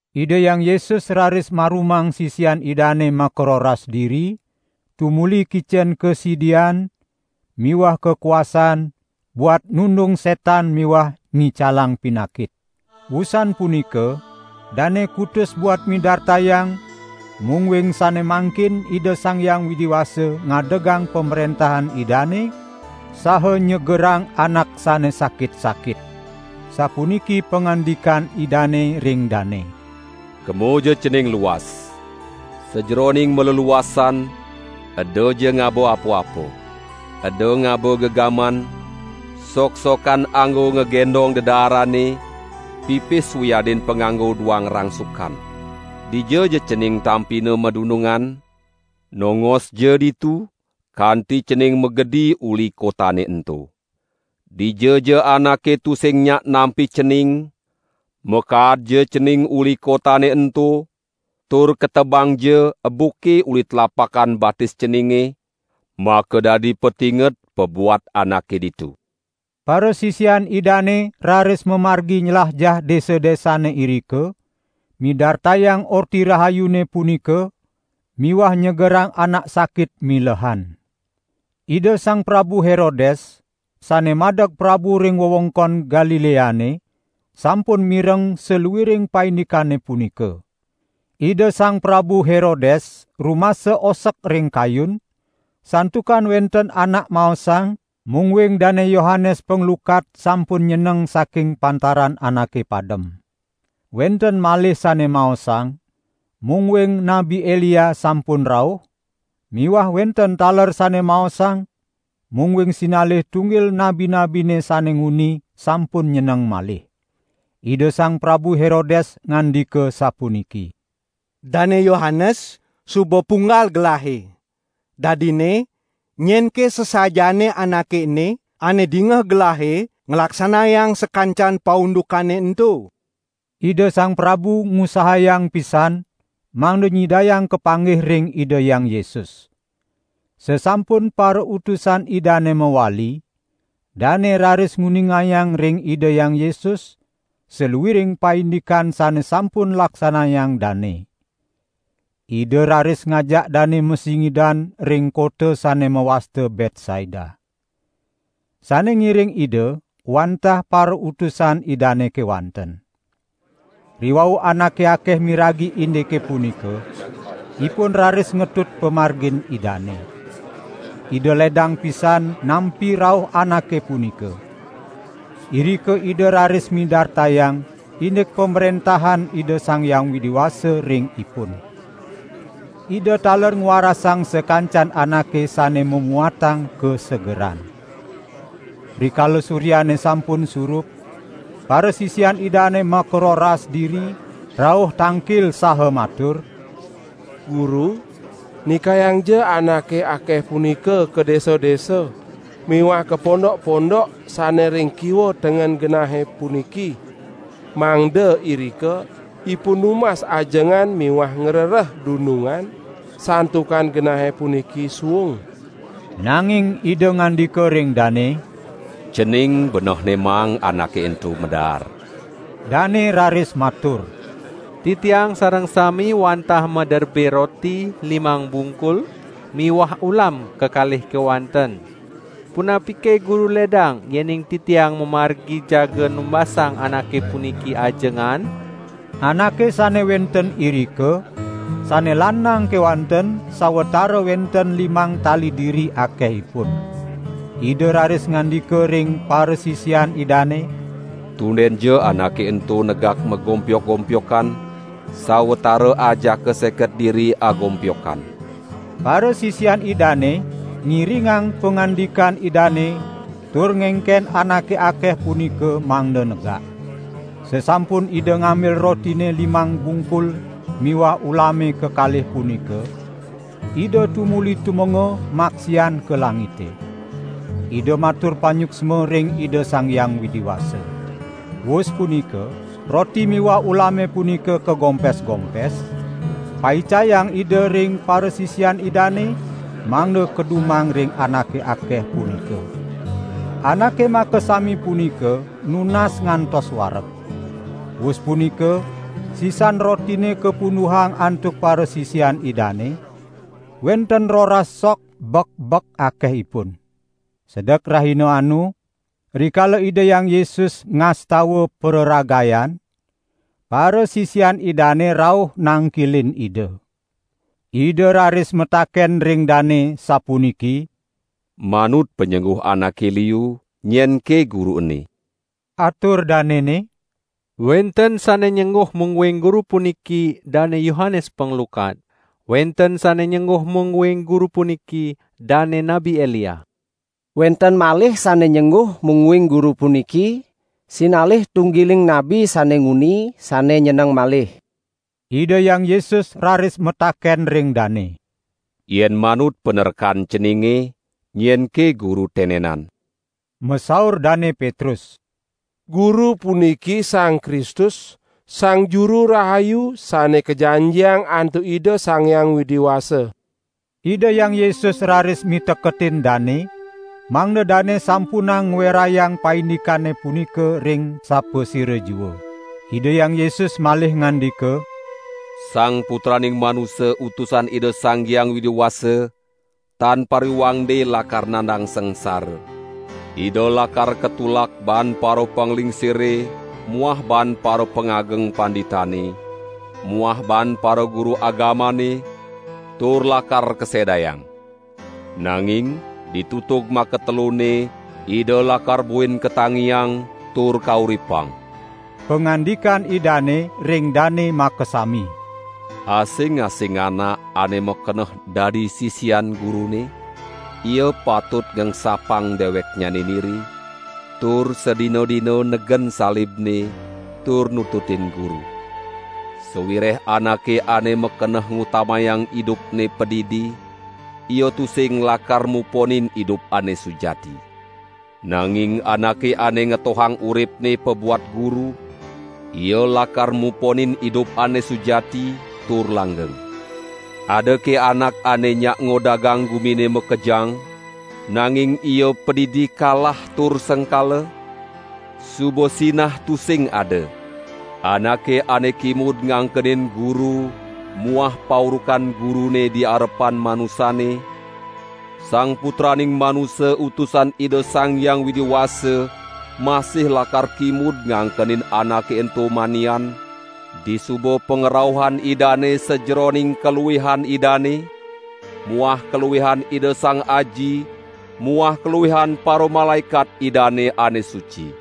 Ida Hyang Yesus raris marumang sisian Idane makaroras diri, tumuli kicen kasidian miwah kakuasaan buat nundung setan miwah ngicalang pinakit. Wusan punika dane kutus buat midartayang mungguing sane mangkin Ida Sang Hyang Widi Wasa ngadegang Pamrentahan Idane saha nyegerang anak sane sakit-sakit. Sapuniki pangandikan Idane ring dane: "Kemaja cening luas! Sajeroning maleluasan, edaja ngaba apa-apa. Eda ngaba gegaman, soksokan anggo ngagendong dedaarane, pipis wiadin panganggo duang rangsukan. Dijaja cening tampina madunungan, nongosja ditu, kanti cening magedi uli kotane ento. Dijaja anake tusing nyak nampi cening, makaadja cening uli kotane ento, tur ketebangja ebuke uli tlapakan batis ceninge, makadadi patinget pabuat anake ditu." Parasisian Idane raris mamargi nylajah desa-desane irika, midartayang Orti Rahayune punika miwah nyegerang anak sakit milehan. Ida Sang Prabu Herodes, sane madeg prabu ring wewengkon Galileane, sampun mireng saluiring paindikane punika. Ida Sang Prabu Herodes rumasa osek ring kayun, santukan wenten anak maosang, mungguing Dane Yohanes Panglukat sampun nyeneng saking pantaran anake padem. Wenten malih sane maosang, mungguing Nabi Elia sampun rauh, miwah wenten taler sane maosang mungguing sinalih tunggil nabi-nabine sane nguni, sampun nyeneng malih. Ida Sang Prabu Herodes ngandika sapuniki: "Dane Yohanes suba punggal gelahe. Dadinne nyenke sasajaane Anake ene, ane dingeh gelahe nglaksanayang sakancan paundukane ento?" Ida sang prabu ngusahayang pisan mangda nyidayang kapanggih ring Ida Hyang Yesus. Sasampun parautusan Idane mawali, dane raris nguningayang ring Ida Hyang Yesus, saluiring paindikan sane sampun laksanayang dane. Ida raris ngajak dane masingidan ring kota sane mawasta Betsaida. Sane ngiring Ida wantah parautusan Idane kewanten. Riwau anake akeh miragi indike punika, ipun raris ngetut pamargin Idane. Ida ledang pisan nampi rauh anake punika. Irika Ida raris midartayang indik Pamrentahan Ida Sang Hyang Widi Wasa ring ipun. Ida taler ngwarasang sakancan anake sane mamuatang kasegeran. Rikala suryane sampun surup, parasisian Idane makaroras diri, rauh tangkil saha matur: "Guru, nikayangja anake akeh punika ka desa-desa miwah ka pondok-pondok sane ring kiwa tengen genahe puniki, mangda irika ipun numbas ajengan miwah ngrereh dunungan, santukan genahe puniki suung." Nanging Ida ngandika ring dane: "Cening benehne maang anake ento daar." Dane raris matur: "Titiang sareng sami wantah maderbe roti limang bungkul miwah ulam kekalih kewanten. Punapike Guru ledang yening titiang mamargi jaga numbasang anake puniki ajengan?" (Anake sane wenten irika, sane lanang kewanten sawatara wenten limang tali diri akehipun.) Ida raris ngandika ring parasisian Idane: "Tundenja anake ento negak magompyok-gompyokan, sawatara ajaka seket diri agompyokan!" Parasisian Idane ngiringang pangandikan Idane tur ngengken anake akeh punika mangda negak. Sasampun Ida ngambil rotine limang bungkul miwah ulame kekalih punika, Ida tumuli tumenga maksian ka langite. Ida matur panyuksma ring Ida Sang Hyang Widi Wasa. Wus punika roti miwah ulame punika kagompes-gompes, paicayang Ida ring parasisian Idane, mangda kadumang ring anake akeh punika. Anake makasami punika nunas ngantos wareg. Wus punika sisan rotine kapunduhang antuk parasisian Idane, wenten roras sok bek-bek akehipun. Sedek rahina anu, rikala Ida Hyang Yesus ngastawa praragayan, parasisian Idane rauh nangkilin Ida. Ida raris mataken ring dane sapuniki: "Manut panyengguh anake liu, nyenke Guru ene?" Atur danene: "Wenten sane nyengguh mungguing Guru puniki Dane Yohanes Panglukat. Wenten sane nyengguh mungguing Guru puniki dane Nabi Elia. Wenten malih sane nyengguh mungguing Guru puniki: Sinalih tunggiling nabi sane nguni sane nyeneng malih." Ida Hyang Yesus raris mataken ring dane: "Yen manut panarkan ceninge, nyenke Guru tenenan?" Masaur Dane Petrus: "Guru puniki Sang Kristus Sang Juru Rahayu Sane Kajanjiang antuk Ida Sang Hyang Widi Wasa." Ida Hyang Yesus raris miteketin dane, mangda dane sampunang ngwerayang paindikane punika ring sapasira jua. Ida Hyang Yesus malih ngandika: "Sang Putraning Manusa Utusan Ida Sang Hyang Widi Wasa tan pariwangde lakar nandang sangsara. Ida lakar katulak baan parapanglingsire muah baan parapangageng panditane muah baan paraguru agamane, tur lakar kasedayang. Nanging ditutug makatelunne Ida lakar buin katangiang tur kauripang." Pangandikan Idane ring dane makasami: "Asing-asing anak ane makeneh dadi sisian Gurune, ia patut ngengsapang deweknyane niri, tur sadina-dina negen salibne tur nututin Guru. Sawireh anake ane makeneh ngutamayang idupne padidi, ia tusing lakar muponin idup ane sujati. Nanging anake ane ngetohang uripne pabuat Guru, ia lakar muponin idup ane sujati tur langgeng. Adake anak ane nyak ngodagang gumine makejang, nanging ia padidi kalah tur sengkala? Suba sinah tusing ada. Anake ane kimud ngangkenin Guru muah paurukan Gurune di arepan manusane, Sang Putraning Manusa Utusan Ida Sang Hyang Widi Wasa masih lakar kimud ngangkenin anake ento manian disuba pangrauhan Idane sajeroning kaluihan Idane muah kaluihan Ida Sang Aji muah kaluihan paramalaekat Idane ane suci.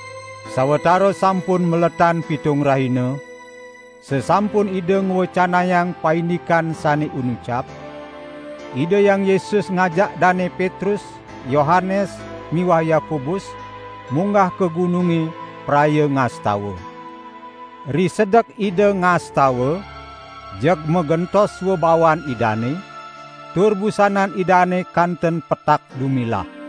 Sawatara sampun maletan pitung rahina, sasampun Ida ngwecanayang paindikan sane inucap, Ida Hyang Yesus ngajak Dane Petrus, Yohanes miwah Yakobus munggah ka gununge praya ngastawa. Risedek Ida ngastawa, jeg magentos swabawan Idane, tur busanan Idane kanten petak dumilah.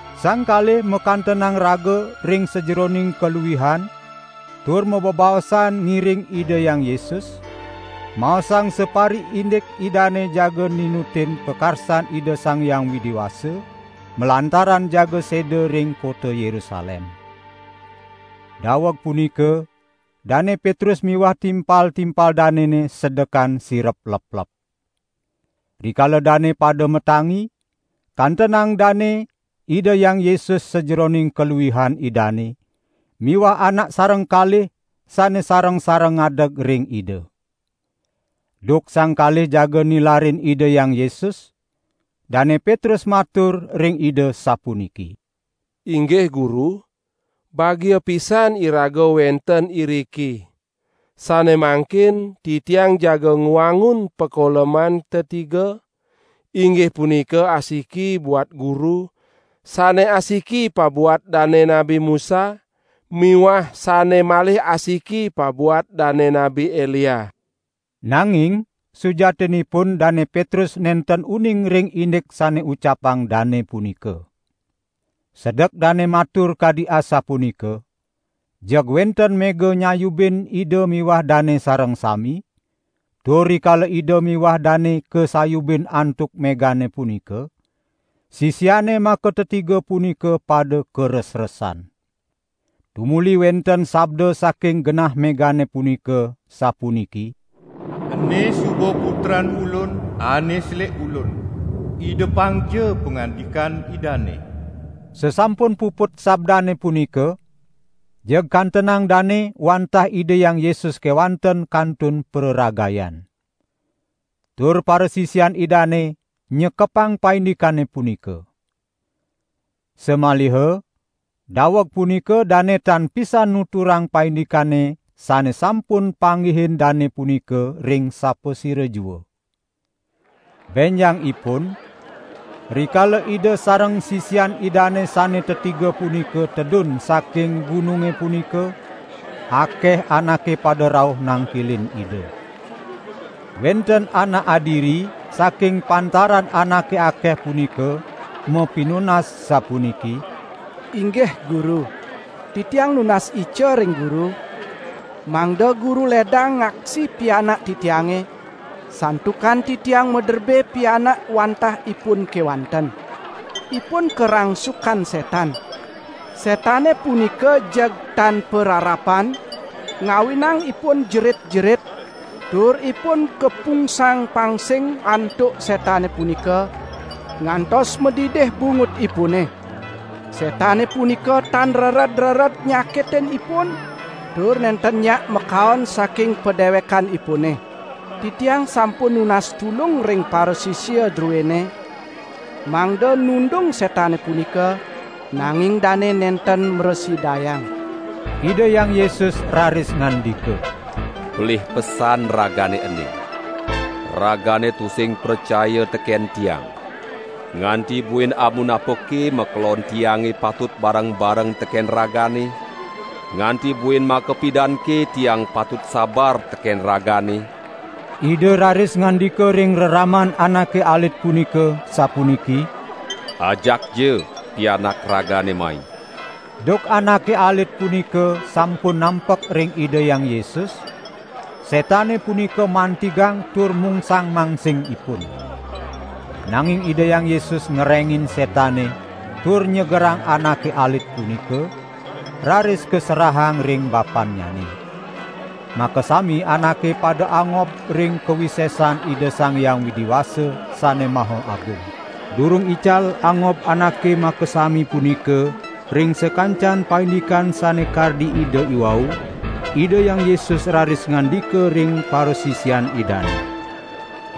Sang kalih makantenang raga ring sajeroning kaluihan tur mabebaosan ngiring Ida Hyang Yesus, maosang sapariindik Idane jaga ninutin pakarsan Ida Sang Hyang Widi Wasa malantaran jaga seda ring kota Yerusalem. Daweg punika Dane Petrus miwah timpal-timpal danene sedekan sirep leplep. Rikala dane pada matangi, kantenang Dane Ida Hyang Yesus sajeroning kaluihan Idane miwah anak sareng kalih sane sareng-sareng ngadeg ring Ida. Duk sang kalih jaga nilarin Ida Hyang Yesus, Dane Petrus matur ring Ida, sapuniki: "Inggih Guru, bagia pisan iraga wenten iriki. Sane mangkin titiang jaga ngwangun pakoleman tetiga, inggih punika asiki buat Guru, sane asiki pabuat dane Nabi Musa miwah sane malih asiki pabuat dane Nabi Elia." (Nanging sujatinipun Dane Petrus nenten uning ring indik sane ucapang dane punika.) Sedek dane matur kadi asapunika, jeg wenten mega nyayubin Ida miwah dane sareng sami, tur rikala Ida miwah dane kasayubin antuk megane punika, sisiane makatetiga punika pada karesresan. Tumuli wenten sabda saking genah megane punika, sapuniki: "Ene suba Putran Ulun ane selik Ulun. Idepangja pangandikan Idane." Sasampun puput sabdane punika, jeg kantenang dane wantah Ida Hyang Yesus kewanten kantun praragayan. Tur parasisian Idane nyekepang paindikane punika. Samaliha daweg punika dane tan pisan nuturang paindikane sane sampun panggihin dane punika ring sapasira jua. Benjangipun rikala Ida sareng sisian Idane sane tetiga punika tedun saking gununge punika, akeh anake pada rauh nangkilin Ida. Wenten anak adiri saking pantaran anake akeh punika mapinunas sapuniki: "Inggih Guru, titiang nunas ica ring Guru, mangda Guru ledang ngaksi pianak titiange, santukan titiang maderbe pianak wantah ipun kewanten. Ipun karangsukan setan. Setane punika jeg tan pararapan ngawinang ipun jerit-jerit, tur ipun kapungsang-pangsing antuk setane punika, ngantos madidih bungutipune. Setane punika tan rered-rered nyakitin ipun tur nenten nyak makaon saking padewekanipune. Titiang sampun nunas tulung ring parasisia druene, mangda nundung setane punika, nanging dane nenten mrasidayang." Ida Hyang Yesus raris ngandika: "Pelih pesan ragane ene! Ragane tusing pracaya teken Tiang. Nganti buin amunapake makelon Tiange patut bareng-bareng teken ragane? Nganti buin makapidanke Tiang patut sabar teken ragane?" Ida raris ngandika ring reraman anake alit punika, sapuniki: "Ajakja pianak ragane mai!" Duk anake alit punika sampun nampek ring Ida Hyang Yesus, setane punika mantigang tur mungsang-mangsing ipun. Nanging Ida Hyang Yesus ngerengin setane tur nyegerang anake alit punika, raris kaserahang ring bapannyane. Makasami anake pada angob ring kawisesan Ida Sang Hyang Widi Wasa sane maha agung. Durung ical angob anake makasami punika ring sakancan paindikane sane kardi Ida iwau, Ida Hyang Yesus raris ngandika ring parasisian Idane: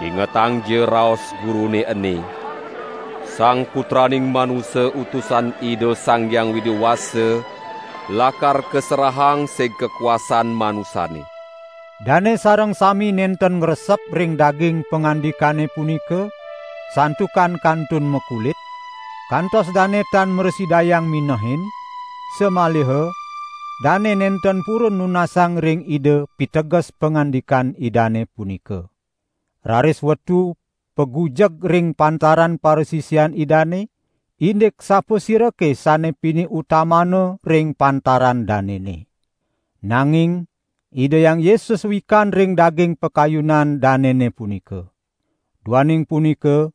"Ingetangja raos Gurune ene: Sang Putraning Manusa Utusan Ida Sang Hyang Widi Wasa lakar kaserahang sig kakuasaan manusane." Dane sareng sami nenten ngresep ring daging pangandikane punika, santukan kantun makulit, kantos dane tan mrasidayang minehin, samaliha dane nenten purun nunasang ring Ida piteges pangandikan Idane punika. Raris wetu pagujeg ring pantaran parasisian Idane, indik sapasirake sane pinih utamana ring pantaran danene. Nanging Ida Hyang Yesus wikan ring daging pakayunan danene punika. Duaning punika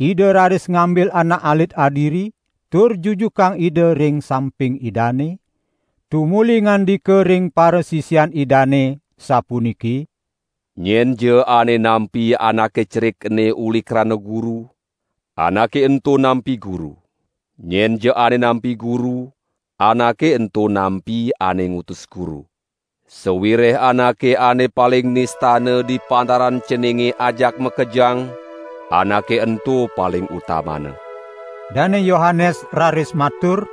Ida raris ngambil anak alit adiri tur jujukang Ida ring samping Idane, tumuli ngandika ring parasisian Idane sampuniki: "Nyenja ane nampi anake cerik ene uli krana Guru, anake ento nampi Guru. Nyenja ane nampi Guru, anake ento nampi ane ngutus Guru. Sawireh anake ane paling nistana di pantaran ceninge ajak makejang, anake ento paling utamana." Dane Yohanes raris matur: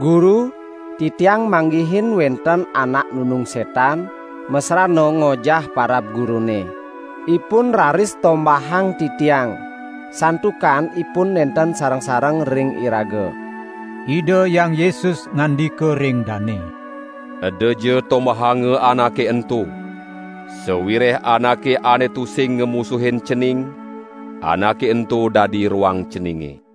"Guru, titiang manggihin wenten anak nundung setan masrana ngojah parab Gurune. Ipun raris tombahang titiang, santukan ipun nenten sareng-sareng ring iraga." Ida Hyang Yesus ngandika ring dane: "Edaja tombahanga anake ento! Sawireh anake ane tusing ngamusuhin cening, anake ento dadi roang ceninge."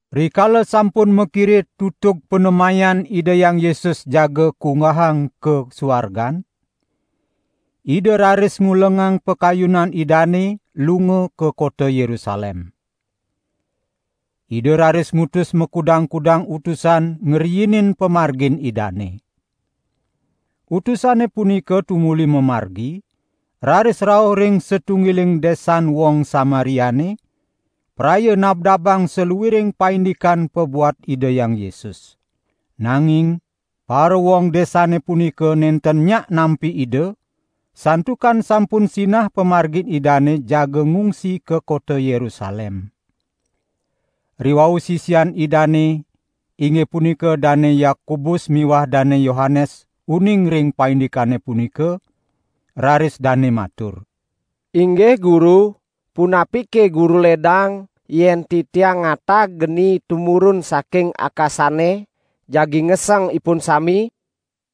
Rikala sampun makire tutug panemayan Ida Hyang Yesus jaga kunggahang ka suargan, Ida raris ngulengang pakayunan Idane lunga ka kota Yerusalem. Ida raris ngutus makudang-kudang utusan ngriinin pamargin Idane. Utusane punika tumuli mamargi, raris rauh ring satunggiling desan wong Samariane, praya nabdabang saluiring paindikan pabuat Ida Hyang Yesus. Nanging parawong desane punika nenten nyak nampi Ida, santukan sampun sinah pamargin Idane jaga ngungsi ka kota Yerusalem. Riwau sisian Idane, inggih punika Dane Yakobus miwah Dane Yohanes uning ring paindikane punika, raris dane matur: "Inggih Guru, punapike Guru ledang, yen titiang ngatag geni tumurun saking akasane, jagi ngeseng ipun sami?"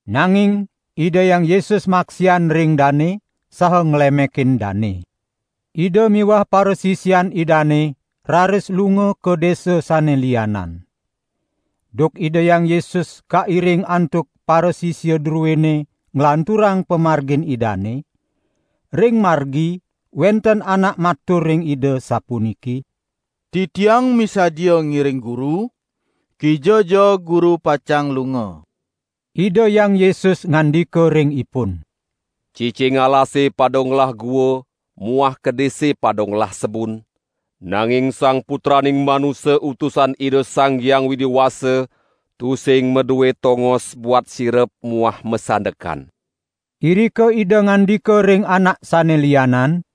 Nanging Ida Hyang Yesus maksian ring dane, saha nglemekin dane. Ida miwah parasisian Idane raris lunga ka desa sane lianan. Duk Ida Hyang Yesus kairing antuk parasisia druene nglanturang pamargin Idane, ring margi wenten anak matur ring Ida sapuniki: "Titiang misadia ngiring Guru, kijaja Guru pacang lunga!" Ida Hyang Yesus ngandika ring ipun: "Cicing alasane pada ngelah gua muah kedise pada ngelah sebun, nanging Sang Putraning Manusa Utusan Ida Sang Hyang Widi Wasa tusing madue tongos buat sirep muah masandekan." Irika Ida ngandika ring anak sane lianan: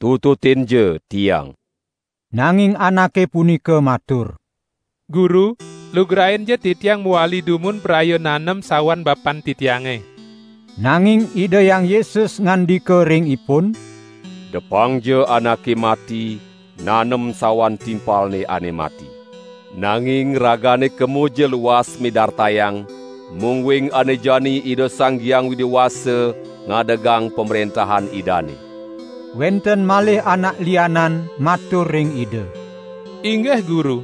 "Tututinja Tiang!" Nanging anake punika matur: "Guru lugrainja titiang mawali dumun praya nanem sawan bapan titiange!" Nanging Ida Hyang Yesus ngandika ring ipun: "Depangja anake mati nanem sawan timpalne ane mati. Nanging ragane kemaja luas midartayang mungguing ane jani Ida Sang Hyang Widi Wasa ngadegang Pamrentahan Idane." Wenten malih anak lianan matur ring Ida: "Inggih Guru,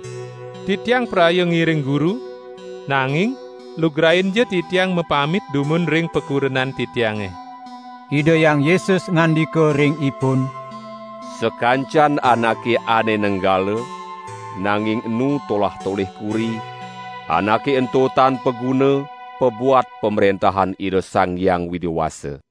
titiang praya ngiring Guru, nanging lugrainja titiang mapamit dumun ring pakurenan titiange." Ida Hyang Yesus ngandika ring ipun: "Sakancan anake ane nenggala, nanging enu tolah-tolih kuri, anake ento tan paguna, pabuat Pamrentahan Ida Sang Hyang Widi Wasa."